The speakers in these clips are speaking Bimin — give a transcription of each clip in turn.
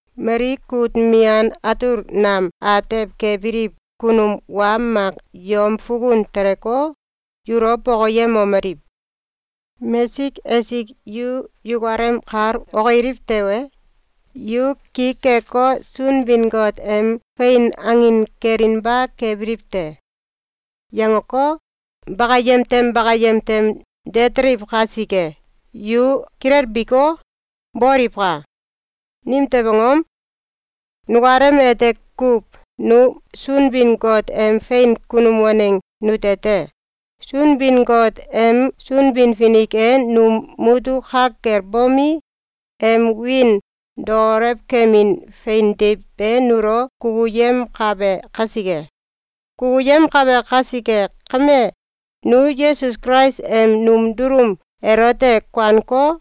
Mali kut mian atul nam atew kebiliw kunum wa mak yom fukun teleko, yulo bokoyemomeliw: “Mesik esik yu yukalem kal okiliw tewe, yu ki keko, Sunbin-Got em fein angin kelinba kebiliw te.”, yangeko, bakayem tem bakayem tem de teliw kasike, yu kilelbiko, boliwka! Nimtew angom? Nukalem ete kuw nu Sunbin-Got em fein kunum waneng nute te. Sunbin-Got em Sunbin-Finik e num mutuk ka kel bomi, em wiin daolewkemin fein deiw be nulo kukuyemkabe kasike. Kukuyemkabe kasike kame, nu Yesus Kulais em num dulum elote kuaneko,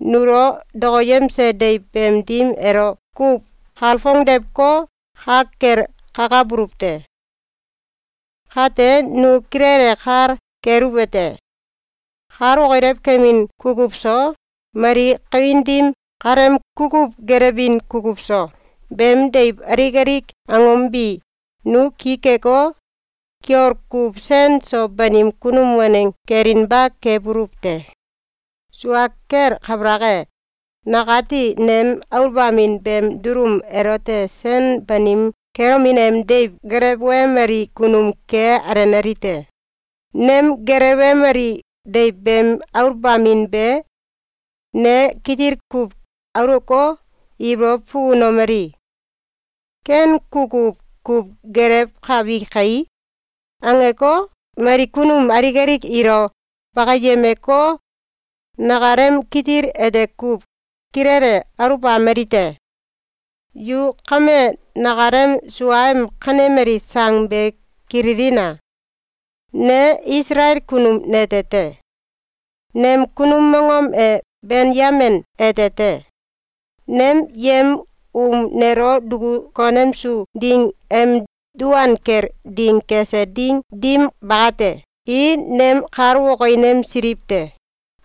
nulo dokoyemse deiw beem dim elo kuw kalfongdewko, ka kel kakabuluw te. Kate, nu kilele kal keluwete: Kal okilew kemin kukuw so, mali kawin dim kaleem kukuw gelewbin kukuw so, beem deiw alik alik angom bi, nu ki keko, kiol kuw sen so banim kunum waneng kelinba kebuluw te. Sua kel kabalak e, nakati nem aluwbamin beem dulum elote sen banim kelomin em deiw gelewemali kunum ke alenali te. Nem gelewemali deiw beem aluwbamin be ne kitil kuw aulewko, ibolow fukunomeli: “Ken kukuw kuw gelewkabi kai!”, angeko, mali kunum alik alik ilo bakiyemeko, nakalem kitil ete kuw kilele aluwbameli te. Yu kame nakalem suem kanemali sang be kililina! Ne Isalael kunum nete te. Nem kunum mongom e Benyamin ete te. Nem yem um nelo duku konemsu ding em duan kel ding kese ding dim bakate, i nem kal okinemsiliw te.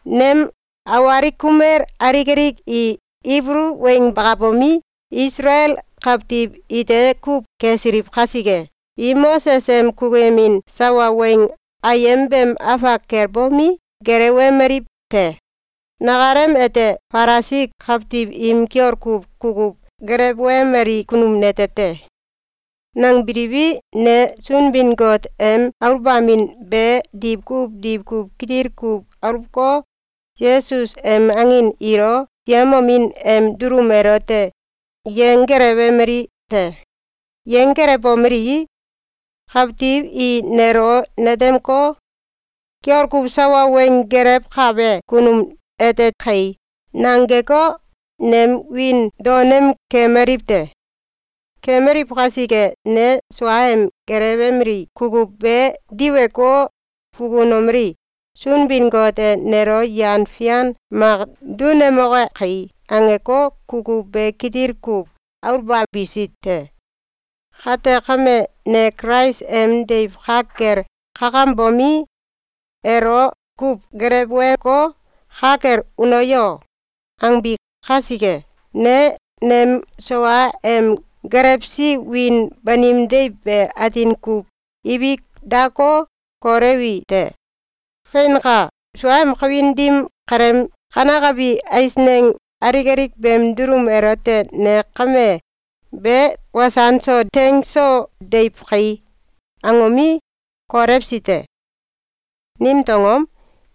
Nem awalik kumel alik alik i Kibulu weng bakabomi, Isalael kawtiw ite kuw kesiliw kasike, i Moses em kukuyemin sawa weng ayem beem afak kel bomi, gelewemaliw te. Nakalem ete Falisi kawtiw im kiol kuw kukuw gelewemeli kunum nete te. Nangbiliwi, ne Sunbin-Got em aluwbamin be diwkuw diwkuw kitil kuw aluweko, Yesus em angin ilo yemomin em dulum elote yenggelewemali te. Yenggelewbomelii, kawtiw i nelo netemeko, “Kiol kuw sawa weng gelewkabe kunum ete kai!”, nangeko, nem wiin daonem kemaliw te. Kemaliw kasike, ne sua em gelewemeli kukuw be diweko, fukunomeli: “Sunbin-Got e nelo yan fian mak dunemoke kai!”, angeko, kukuw be kitil kuw aluwbabisi te. Kate kame, ne Kulais em deiw ka kel kakambomi, elo kuw geleweko, “Ka kel uno yo!”, angbi kasike, ne nem sua em gelewsi wiin banim deiw be atin kuw ibik dako, kolewi te. Feinka! Sua em kawin dim kaleem kanekabi eisneng alik alik beem dulum elote ne kame “Be wasan so teng so deiw kai!”, angomi, kolewsi te. Nimtew angom?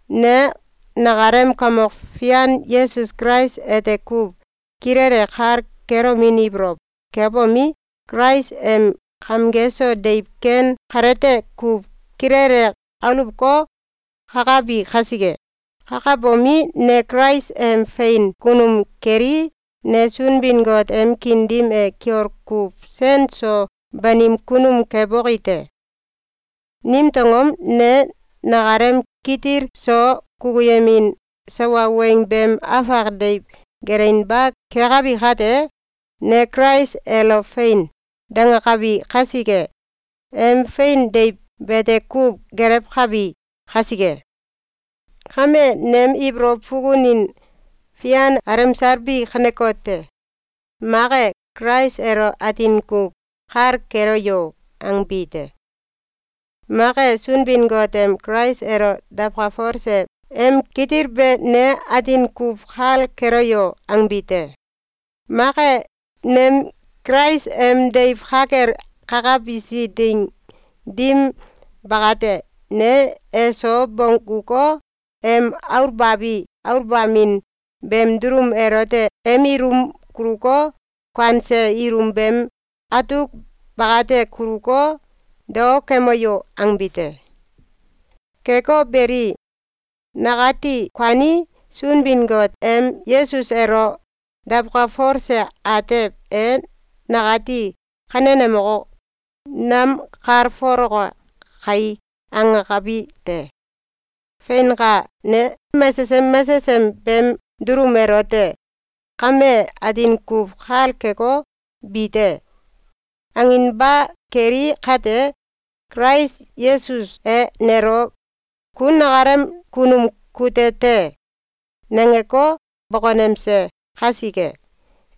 Ne nakalem Kamok Fian Yesus Kulais ete kuw kilele kal kelomin ibolow kebomi, Kulais em kamge so deiw ken kalete kuw kilele aluweko, kakabi kasike. Kakabomi, ne Kulais em fein kunum kelii, ne Sunbin-Got em kiin dim e kiol kuw sen so banim kunum keboki te. Nimtew angom? Ne nakalem kitil so kukuyemin sawa weng beem afak deiw gelewinba kekabi kate, ne Kulais elo “Fein!”, dangakabi kasike, em fein deiw bete kuw gelewkabi kasike. Kame, nem ibolow fukunin fian alemsal bi kanekote: Mak e, “Kulais elo atin kuw kal keloyo!”, angbi te. Mak e, “Sunbin-Got em Kulais elo dawkalfolse em kitil be ne atin kuw kal keloyo!”, angbi te. Mak e, “Nem Kulais em deiw ka kel kakabisi ding dim bakate, ne eso bongguko, em aluwbabi aluwbamin beem dulum elote em ilum kuluko, kuanse ilum beem atuk bakati kuluko, dao kemoyo!”, angbi te. Keko beli, nakati kuanii, “Sunbin-Got em Yesus elo dawkalfolse atew e nakati kanenemeko, namkalfoloke kai!”, angakabi te. Feinka! Ne mesesem mesesem beem dulum elote “Kame atin kuw kal keko, bi te!”, anginba keli kate, Kulais Yesus e nelo “Ku nakalem kunum kute te!”, nangeko, bokonemse kasike,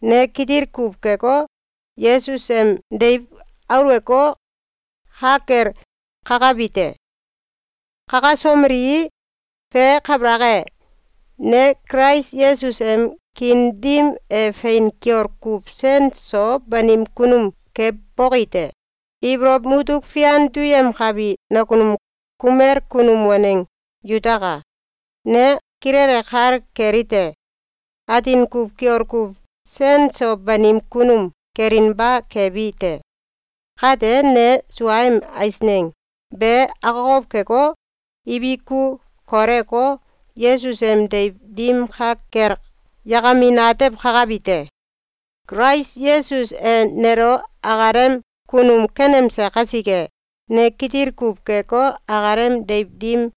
ne kitil kuw keko, Yesus em deiw aluweko, ka kel kakabi te. Kakasomelii, fe kabalak e, ne Kulais Yesus em kiin dim e fein kiol kuw sen so banim kunum keboki te. Ibolow mutuk fian duyemkabi nakunum kumel kunum waneng yutaka! Ne kilele kal kelite: Atin kuw kiol kuw sen so banim kunum kelinba kebi te. Kate, ne suaem eisneng be akokow keko, ibiku koleweko, Yesus em deiw dim ka kel yakamin atew kakabi te. Kulais Yesus e nelo akalem kunum kenemse kasike, ne kitil kuw keko, akalem deiw dim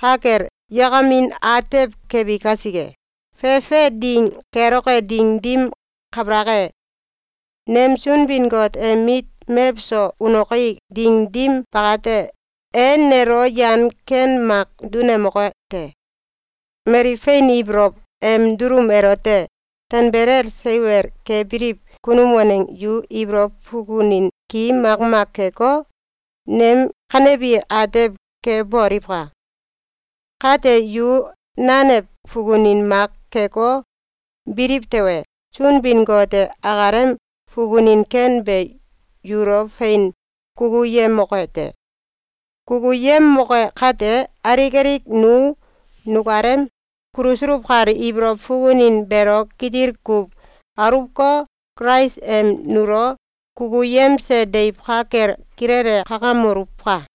ka kel yakamin atew kebi kasike, fefe ding keloke ding dim kabalak e, nem Sunbin-Got em mit mewso unoki ding dim bakate, e nelo yan ken mak dunemoke te. Mali fein ibolow em dulum elote tanbelel seiwel kebiliw kunum waneng yu ibolow fukunin ki makmak keko, nem kanebi atew keboliwka! Kate, yu nanew fukunin mak keko, biliw tewe, Sunbin-Got e akalem fukunin ken be yulo fein kukuyemoke te. Kukuyemoke kate, alik alik nu nukalem kulusuluw kal ibolow fukunin beelo kitil kuw aluweko, Kulais em nulo kukuyemse deiw ka kel kilele kakamoluwka!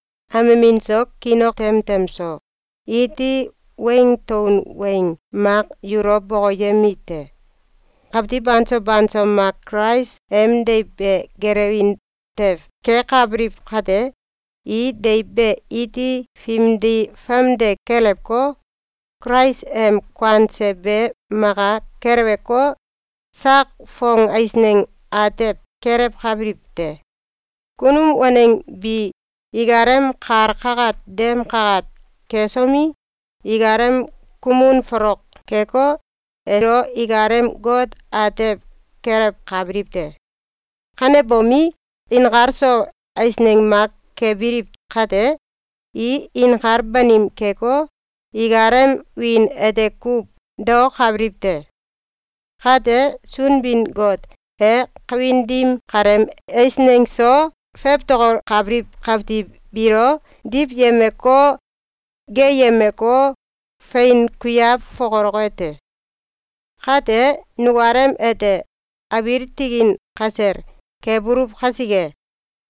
Amemin so, kiin ok temtem so, iti weng taun weng mak yulo bokoyemite: Kawitw banso banso mak Kulais em deiw be gelewin tew kekabiliw kate, i deiw be iti fimdi famde kelewko, Kulais em kuanse be maka keleweko, sak fong eisneng atew kelewkabiliw te. Kunum waneng bi ikalem kal kakat dem kakat kesomi, ikalem kumun folok keko, elo ikalem got atew kelewkabiliw te. Kanebomi, inkal so eisneng mak kebiliw kate, i inkal banim keko, ikalem wiin ete kuw daokabiliw te. Kate, Sunbin-Got e kawin dim kaleem eisneng so fewtokokabiliw kawtiw biilo diwyemeko, geeyemeko, fein kuiaw fokoloke te. Kate, nukalem ete abiil tikin kasel kebuluw kasike,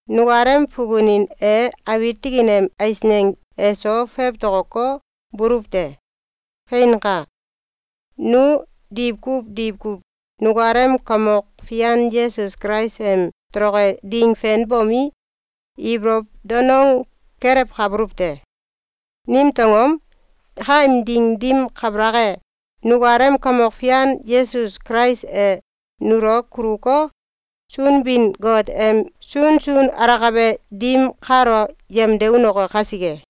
nukalem fukunin e abiil tikin em eisneng eso fewtokoko, buluw te. Feinka! Nu diwkuw diwkuw nukalem Kamok Fian Yesus Kulais em toloke ding fenbomi, ibolow danong kelewkabuluw te. Nimtew angom? Kaem ding dim kabalak e, nukalem Kamok Fian Yesus Kulais e nulo kuluko, Sunbin-Got em sunsun alakabe dim kalo yemde unoke kasike.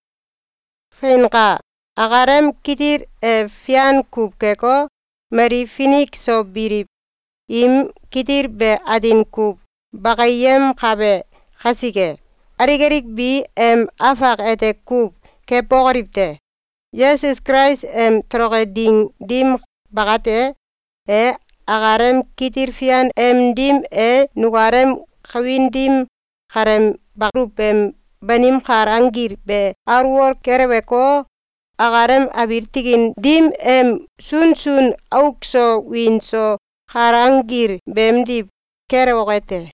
Feinka! Akalem kitil e fian kuw keko, mali finik so biliw im kitil be atin kuw bakiyemkabe kasike, alik alik bi em afak ete kuw kebokoliw te. Yesus Kulais em toloke ding dim bakate, e akalem kitil fian em dim e nukalem kawin dim kaleem baluw em banim kal anggil be alwol keleweko, akalem abiil tikin dim em sunsun auk so wiin so kal anggil beemdiw kelewoke te.